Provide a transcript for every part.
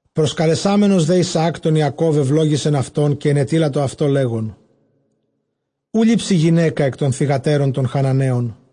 Προσκαλεσάμενος δὲ Ἰσαὰκ τὸν Ἰακὼβ, εὐλόγησεν αὐτὸν, καὶ ἐνετείλατο αὐτῷ, λέγων, οὐ λήψῃ γυναῖκα ἐκ τῶν θυγατέρων τῶν Χαναναίων.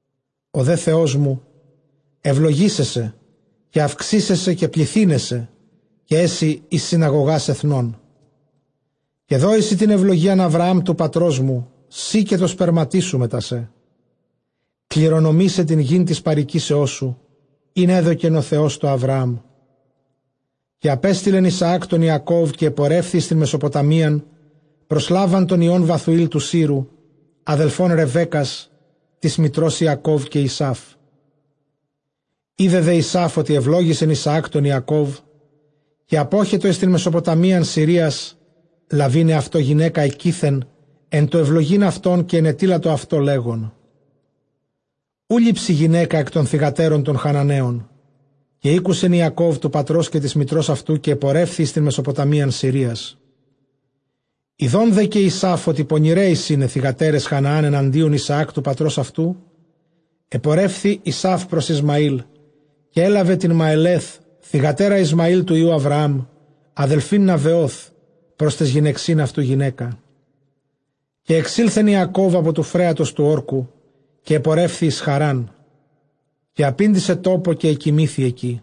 Ὁ δὲ Θεός μου εὐλογήσαι σε, καὶ αὐξήσαι σε, καὶ πληθύναι σε· καὶ ἔσῃ εἰς συναγωγὰς ἐθνῶν. Καὶ δῴη σοι τὴν εὐλόγιαν Ἁβραὰμ τοῦ πατρός μου, σοὶ καὶ τῷ σπέρματί σου μετὰ σὲ, κληρονομῆσαι τὴν γῆν τῆς παροικήσεώς σου, ἣν ἔδωκεν ὁ Θεὸς τῷ Ἁβραάμ. Καὶ ἀπέστειλεν Ἰσαὰκ τὸν Ἰακώβ· καὶ ἐπορεύθη εἰς τὴν Μεσοποταμίαν πρὸς Λάβαν τὸν υἱὸν Βαθουὴλ τοῦ Σύρου, ἀδελφὸν Ῥεβέκκας τῆς μητρὸς Ἰακὼβ καὶ Ἡσαῦ. Ἴδε δὲ Ἡσαῦ ὅτι εὐλόγησεν Ἰσαὰκ τὸν Ἰακὼβ, καὶ ἀπέστειλεν εἰς τὴν Μεσοποταμίαν Συρίας, λαβεῖν ἑαυτῷ γυναῖκα ἐκεῖθεν, ἐν τῷ εὐλογεῖν αὐτόν· καὶ ἐνετείλατο αὐτῷ, λέγων, οὐ λήψῃ γυναῖκα ἐκ τῶν θυγατέρων τῶν Χαναναίων. Καὶ ἤκουσεν Ἰακὼβ τοῦ πατρὸς καὶ τῆς μητρὸς αὐτοῦ· καὶ ἐπορεύθη εἰς τὴν Μεσοποταμίαν Συρίας. Ἰδὼν δὲ καὶ Ἡσαῦ ὅτι πονηραί εἰσιν αἱ θυγατέρες Χαναὰν ἐναντίον Ἰσαὰκ τοῦ πατρὸς αὐτοῦ, ἐπορεύθη Ἡσαῦ πρὸς Ἰσμαήλ· καὶ ἔλαβε τὴν Μαελὲθ, θυγατέρα Ἰσμαὴλ τοῦ υἱοῦ Ἁβραὰμ, ἀδελφὴν Ναβεὼθ, πρὸς ταῖς γυναιξὶν αὐτοῦ γυναῖκα. Καὶ ἐξῆλθεν Ἰακὼβ ἀπὸ τοῦ φρέατος τοῦ ὅρκου, καὶ ἐπορεύθη εἰς Χαῤῥάν. Καὶ ἀπήντησε τόπῳ, καὶ ἐκοιμήθη ἐκεῖ,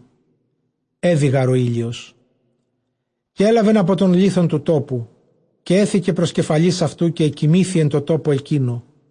ἔδυ γὰρ ὁ ἥλιος· καὶ ἔλαβεν ἀπὸ τῶν λίθων τοῦ τόπου, καὶ ἔθηκε πρὸς κεφαλῆς αὐτοῦ· καὶ ἐκοιμήθη ἐν τῷ τόπῳ ἐκείνῳ.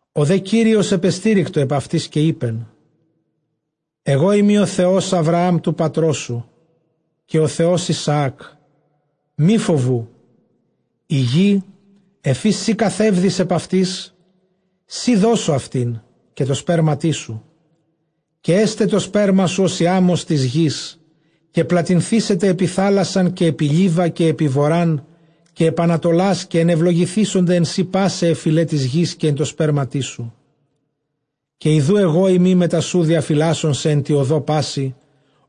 Ὁ δὲ Κύριος ἐπεστήρικτο ἐπʼ αὐτῆς· καὶ εἶπεν, ἐγώ εἰμι ὁ Θεὸς Ἁβραὰμ τοῦ πατρός σου, καὶ ὁ Θεὸς Ἰσαάκ· μὴ φοβοῦ· ἡ γῆ ἐφʼ ἧς σὺ καθεύδεις ἐπʼ αὐτῆς, σοὶ δώσω αὐτὴν, καὶ τῷ σπέρματί σου. Καὶ ἔσται τὸ σπέρμα σου ὡς ἡ ἄμμος τῆς γῆς, καὶ πλατυνθήσεται ἐπὶ θάλασσαν, καὶ Λίβα, καὶ Βοῤῥὰν, καὶ ἐπὶ ἀνατολάς· καὶ ἐνευλογηθήσονται ἐν σοὶ πᾶσαι αἱ φυλαὶ τῆς γῆς, καὶ ἐν τῷ σπέρματί σου. Καὶ ἰδοὺ ἐγώ εἰμι μετὰ σοῦ, διαφυλάσσων σε ἐν τῇ ὁδῷ πάσῃ,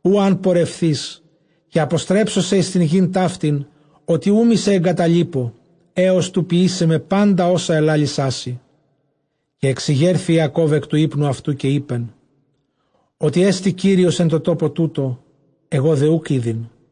οὗ ἂν πορευθῇς· καὶ ἀποστρέψω σε εἰς τὴν γῆν ταύτην· ὅτι οὐ μή σε ἐγκαταλίπω, ἕως τοῦ ποιῆσαί με πάντα ὅσα ἐλάλησά σοι. Καὶ ἐξηγέρθη Ἰακὼβ ἐκ τοῦ ὕπνου αὐτοῦ, καὶ εἶπεν, ὅτι ἔστι Κύριος ἐν τῷ τόπῳ τούτῳ, ἐγὼ δὲ οὐκ ᾔδειν.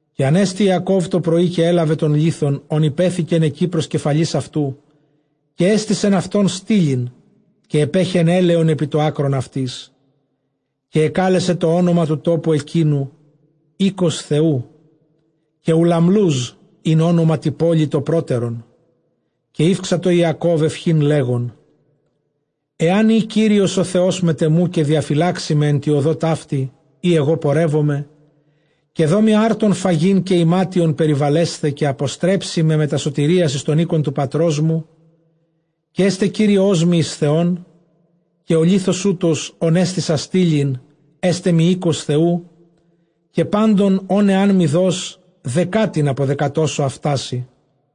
Καὶ ἀνέστη Ἰακὼβ τὸ πρωῒ, καὶ ἔλαβε τὸν λίθον, ὃν ὑπέθηκεν ἐκεῖ πρὸς κεφαλῆς αὐτοῦ, καὶ ἔστησεν αὐτὸν στήλην, καὶ ἐπέχεεν ἔλαιον ἐπὶ τὸ ἄκρον αὐτῆς. Καὶ ἐκάλεσε τὸ ὄνομα τοῦ τόπου ἐκείνου, οἶκος Θεοῦ· καὶ Οὐλαμλοὺζ ἦν ὄνομα τῇ πόλει τὸ πρότερον. Καὶ ηὔξατο Ἰακὼβ εὐχὴν, λέγων, ἐὰν ᾖ Κύριος ὁ Θεὸς μετʼ ἐμοῦ, καὶ διαφυλάξῃ με ἐν τῇ ὁδῷ ταύτῃ, ᾗ ἐγὼ πορεύομαι, καὶ δῷ μοι ἄρτον φαγεῖν, καὶ ἱμάτιον περιβαλέσθαι, καὶ ἀποστρέψῃ με μετὰ σωτηρίας εἰς τὸν οἶκον τοῦ πατρός μου, καὶ ἔσται Κύριός μοι εἰς Θεόν. Καὶ ὁ λίθος οὗτος, ὃν ἔστησα στήλην, ἔσται μοι οἶκος Θεοῦ· καὶ πάντων ὧν ἐάν μοι δῷς, δεκάτην ἀποδεκατώσω αὐτά σοι.